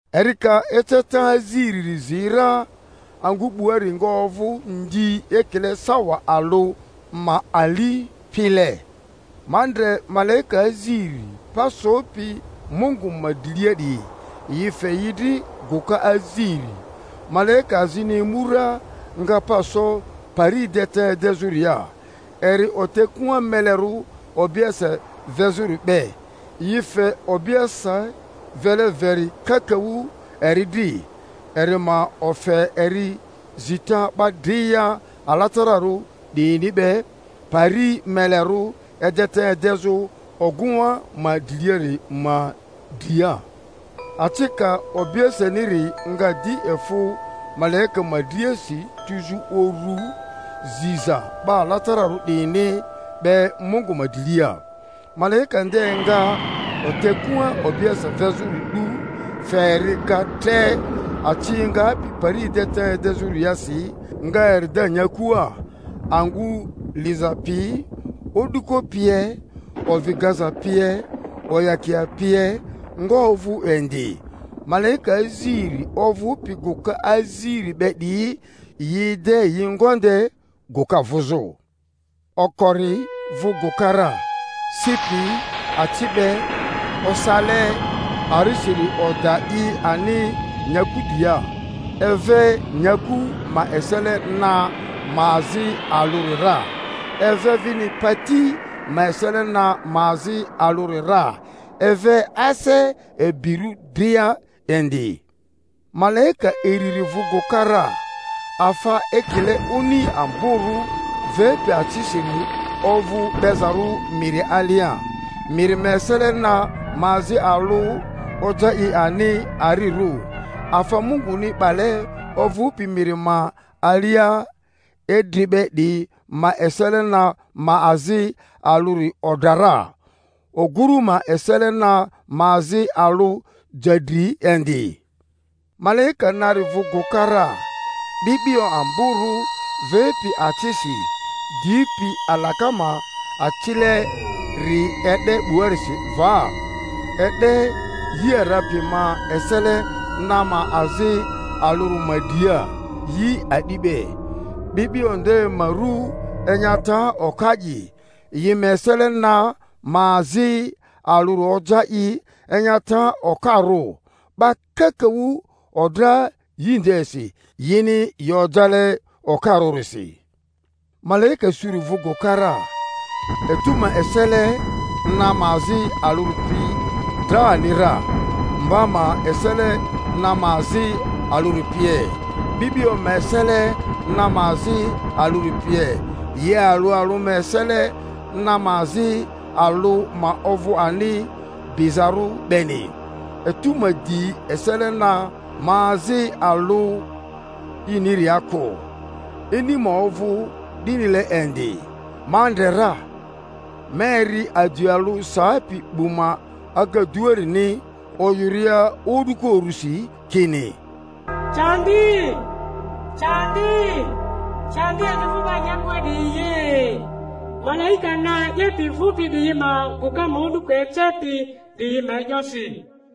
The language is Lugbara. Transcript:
Eri ka eceta aziriri zi ra, angᴜ 'buari nga ovᴜ ndi ekile sawa alᴜ ma ali pile. Ma ndre malaika aziri pa sopi Mungu ma drilia 'diyi, yi fe yi dri gᴜka aziri. Malaika azini emu ra, nga pa so pari edeta edezᴜria, eri otekua melerᴜ obiese vezᴜri be; yi fe obiese vele veri kakaᴜ eri dri, eri ma ofe eri zita 'ba dria alatararᴜ 'diyini be pari melerᴜ edeta edezᴜ ogᴜŋa ma driliari ma dria. Acika obieseniri nga di efᴜ malaika ma driasi tuzᴜ uru ziza 'ba alatararᴜ 'diyini be Mungu ma drilia. Malaika nde nga otekua obiese vezᴜri 'du, fe eri ga tre aci engapi pari edeta edezᴜriarisi, nga eri da nyakua; angᴜ liza pi, o'duko pie, ovi gaza pie, oyakia pie nga ovᴜ indi. Malaika aziri ovᴜpi gᴜka aziri be 'diyi yi ede yi ngonde gᴜka vᴜzᴜ. Okori vᴜ gᴜka ra, si pi aci be osale arisiri oda i ani nyaku dria; eve nyaku ma esele na ma azi alᴜri ra, eve vini pati ma esele na ma azi alᴜri ra, eve ase ibirᴜ dria indi. Malaika iriri vᴜ gᴜka ra, afa ekile oni amborᴜ vepi acisiri ovᴜ 'bezarᴜ miri alia; miri ma esele na ma azi alᴜ oja i ani arirᴜ, afa Munguni 'bale ovᴜpi miri ma alia idri be 'diyi ma esele na ma azi alᴜri odra ra, oguru ma esele na ma azi alᴜ ja dri indi. Malaika nari vᴜ gᴜka ra, 'bi'bio amborᴜ vepi acisi dipi alaka ma acileri e'de 'buasi va, e'de yi ara piyi ma esele na ma azi alᴜri ma dria, yi a'di be. 'Bi'bio nde ma ru Enyata Oka'i. Yi ma esele na ma azi alᴜri oja i enyata okarᴜ; 'ba kakaᴜ odra yi ndesi, yini yi ojale okarᴜrisi. Malaika suri vᴜ gᴜka ra, etu ma esele na ma azi alᴜri pi dra ani ra, mba ma esele na ma azi alᴜri pie, 'bi'bio ma esele na ma azi alᴜri pie, yi alᴜ alᴜ ma esele na ma azi alᴜ ma ovᴜ ani bizarᴜ beni; etu ma di esele na ma azi alᴜ iniria kᴜ, ini ma ovᴜ 'dinile indi. Ma ndre ra, ma eri aji alᴜ sapi 'bu ma agaduarini oyᴜria o'duko urusi kini, Candi, candi, candi emi vᴜ 'ba nyakua 'diyi ye! malaika na 'yepi vᴜpi 'diyi ma gᴜka ma o'duko acepi 'diyi ma e'yosi!